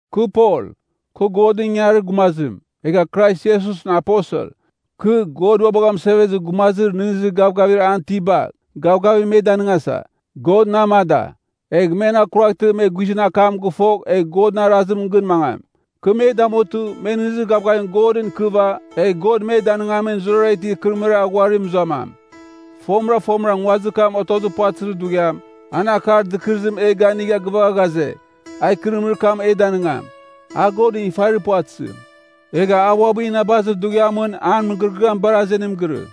Kɨ Pol, kɨ Godɨn ingangarir gumazim, egha Krais Iesusɨn aposel. Kɨ, God ua bagha mɨsevezir gumazir nɨghnɨzir gavgavir an itiba, gavgavim me danɨngasa, God na amada. Egh men akuraghtɨ me guizɨn akam gɨfogh egh Godɨn arazim gɨn mangam. Kɨ me damutɨ, me nɨghnɨzir gavgavim Godɨn ikɨva, egh God me danɨngamin zurara itir ikɨrɨmɨrir aghuarim mɨzuamam. Fomɨra fomɨra nguazir kam otozir puvatɨzir dughiam, an akar dɨkɨrɨzim e ganigha gɨvagha ghaze, a ikɨrɨmɨrir kam e danɨngam. A Godɨn ifarir puvatɨzim. Egha a uabɨ inabazir dughiamɨn an mɨgɨrɨgɨam bar azenim girɨ.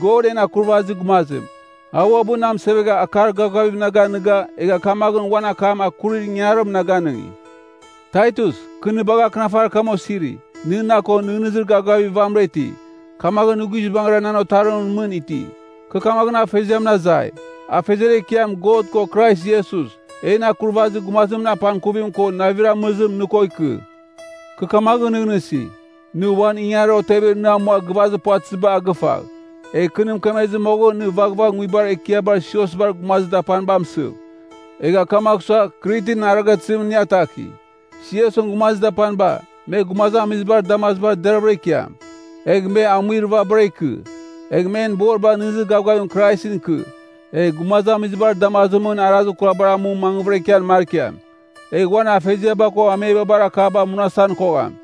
God en Akurvazir Gumazim, a uabɨ na amɨsevegha akar gavgavim na ganiga egha kamaghɨn uan akam akurir ingangarim na ganɨngi. Taitus, kɨ nɨ bagha akɨnafarir kam osiri. Nɨ na ko nɨghnɨzir gavgavir vamɨra iti, kamaghɨn nɨ guizbangɨra nan otarimɨn mɨn iti. Kɨ kamaghɨn Afeziamɨn azai, Afeziar Ekiam God ko Krais Iesus, en Akurvazir Gumazimɨn apangkuvim ko navir amɨrɨzim nɨ ko ikɨ. Kɨ kamaghɨn nɨghnɨsi, nɨ uan ingangarir otevir nɨ amua gɨvazir puvatɨziba a gɨvagh, egh kɨ nɨ mɨkemezir moghɨn nɨ vaghvagh nguibar ekiabar siosbar gumazir dapaniba amɨsɨv. Egha kamagh sua, Kritɨn arighatɨzimɨn nɨ ataki. Siosɨn gumazir dapaniba, me gumazamizibar damazibar deraghavɨra ikiam. Egh me amuir vabara ikɨ. Egh men boriba nɨghnɨzir gavgavim Kraisɨn ikɨ, egh gumazamizibar damazimɨn arazir kurabar amu mangvɨra ikian markiam. Egh uan afeziaba ko amebabar akaba munasan kogham.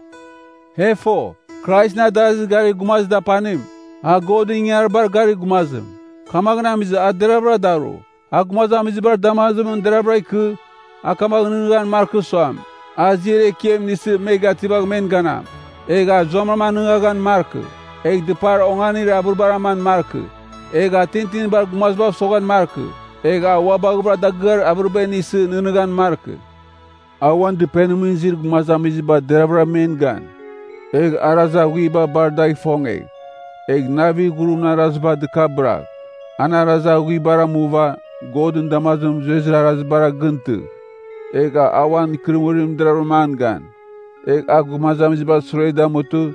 E fo, Kraisɨn adarazir garir gumazir dapanim, a Godɨn ingangaribar garir gumazim. Kamaghɨn amizɨ a deraghvɨra daru, a gumazamizibar damazimɨn deraghvɨra ikɨ, a kamaghɨn nɨghnɨghan markɨ suam, a ziar ekiam inisɨ me gativagh men ganam. Egh a zuamram anɨngaghan markɨ. Egh dɨpar onganir avɨribar aman markɨ. Egh a tintinibar gumazibav soghan markɨ, egh a ua baghɨvɨra dagɨar avɨriba inisɨ, nɨghnɨghan markɨ. A uan dɨpenimɨn izir gumazamiziba deraghvɨra men gan. Egh arazir aghuiba bar dagh ifongegh, egh navir ghurimɨn araziba dɨkabɨragh. An arazir aghuibar amuva, Godɨn damazimɨn zuezir arazibara gɨn tɨgh. Egh a uan ikɨrɨmɨrim deravɨram an gan. Egh a gumazamizibar sure damutɨ,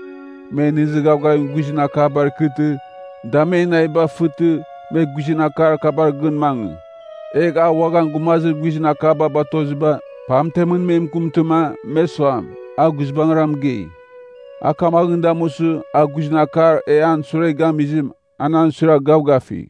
me nɨghnɨzir gavgavim guizɨn akabar ikɨtɨ, da men naviba fɨtɨ, me guizɨn akar kabar gɨn mangɨ. Egh a uaghan gumazir guizɨn akaba batoziba, pamtemɨn me mɨkɨmtɨma, me suam, a guizbangɨra mɨgei. A kamaghɨn damusɨ, a guizɨn akar e an sure gamizim, an an suiragh gavgafigh.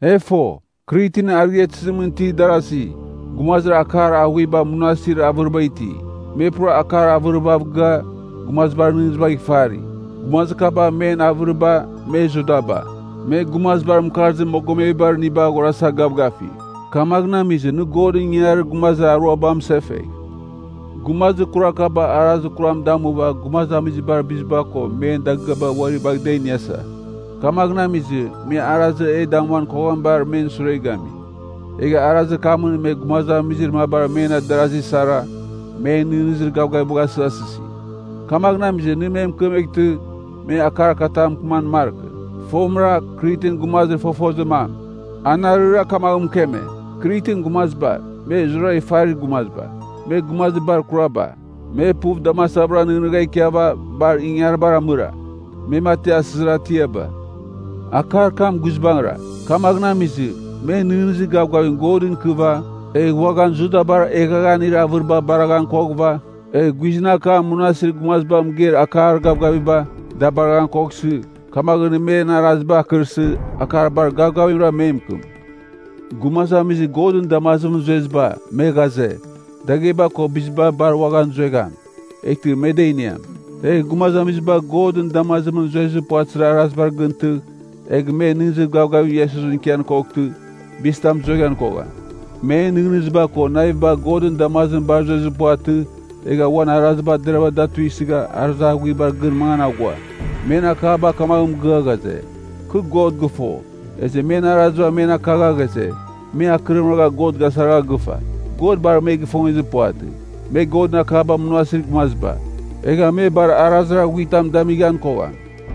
E fo, Kritɨn arighatɨzimɨn itir darasi, gumazir akar aghuiba munasir avɨriba iti. Me pura akar avɨribav gɨa, gumazibar nɨghnɨzibagh ifari. Gumazir kaba men avɨriba, me Judaba, me gumazibar mɨkarzir mogomebar iniba aghorasa gavgafi. Kamaghɨn amizɨ nɨ Godɨn ingangarir gumazir aruaba amɨsefegh. Gumazir kurar kaba arazir kuram damuva gumazamizibar biziba ko men dagɨaba uari bagh da iniasa. Kamaghɨn amizɨ, me arazir e damuan koghamibar men sure gami. Egha arazir kamɨn me gumazamizir mabar men adarasi sara, men nɨghnɨzir gavgavibagh asɨghasɨsi. Kamaghɨn amizɨ nɨ me mɨkemeghtɨ me akar katam mɨkɨman markɨ. Fomɨra, Kritɨn gumazir fofozir mam, anarɨra kamaghɨn mɨkeme, “Kritɨn gumaziba, me zurara ifarir gumaziba, me gumazir bar kuraba. Me puv damasavɨra nɨghnɨgha ikiava, bar ingangaribar amɨra. Me mati asɨzir atiaba.” Akar kam guizbangɨra. Kamaghɨn amizɨ, me nɨghnɨzir gavgavim Godɨn ikɨva, egh uaghan Judabar eghaghanir avɨriba baraghan koghɨva, egh guizɨn akamɨn munasir gumazibar mɨgeir akar gavgaviba, da baraghan koghsɨ, kamaghɨn nɨ men araziba akɨrsɨ, akar bar gavgavimra me mɨkɨm. Gumazamizir Godɨn damazimɨn zueziba, me ghaze, dagheba ko biziba bar uaghan zuegham, eghtɨ me da iniam. Egh gumazamiziba Godɨn damazimɨn zuezir puvatɨzir arazibar gɨn tɨgh, egh me nɨghnɨzir gavgavim Iesusɨn ikian koghtɨ, bizitam zueghan kogham. Men nɨghnɨziba ko naviba Godɨn damazimɨn bar zuezir puvatɨ, egha uan araziba deravɨra da tuisɨgha arazir aghuibar gɨn mangan aghua. Men akaba kamaghɨn mɨgɨa ghaze, “Kɨ God gɨfo.” Ezɨ men araziba men akakagha ghaze, me akɨrim ragha God gasaragha gɨfa. God bar me gifongezir puvatɨ. Me Godɨn akaba munasir gumaziba, egha me bar arazir aghuitam damighan kogham.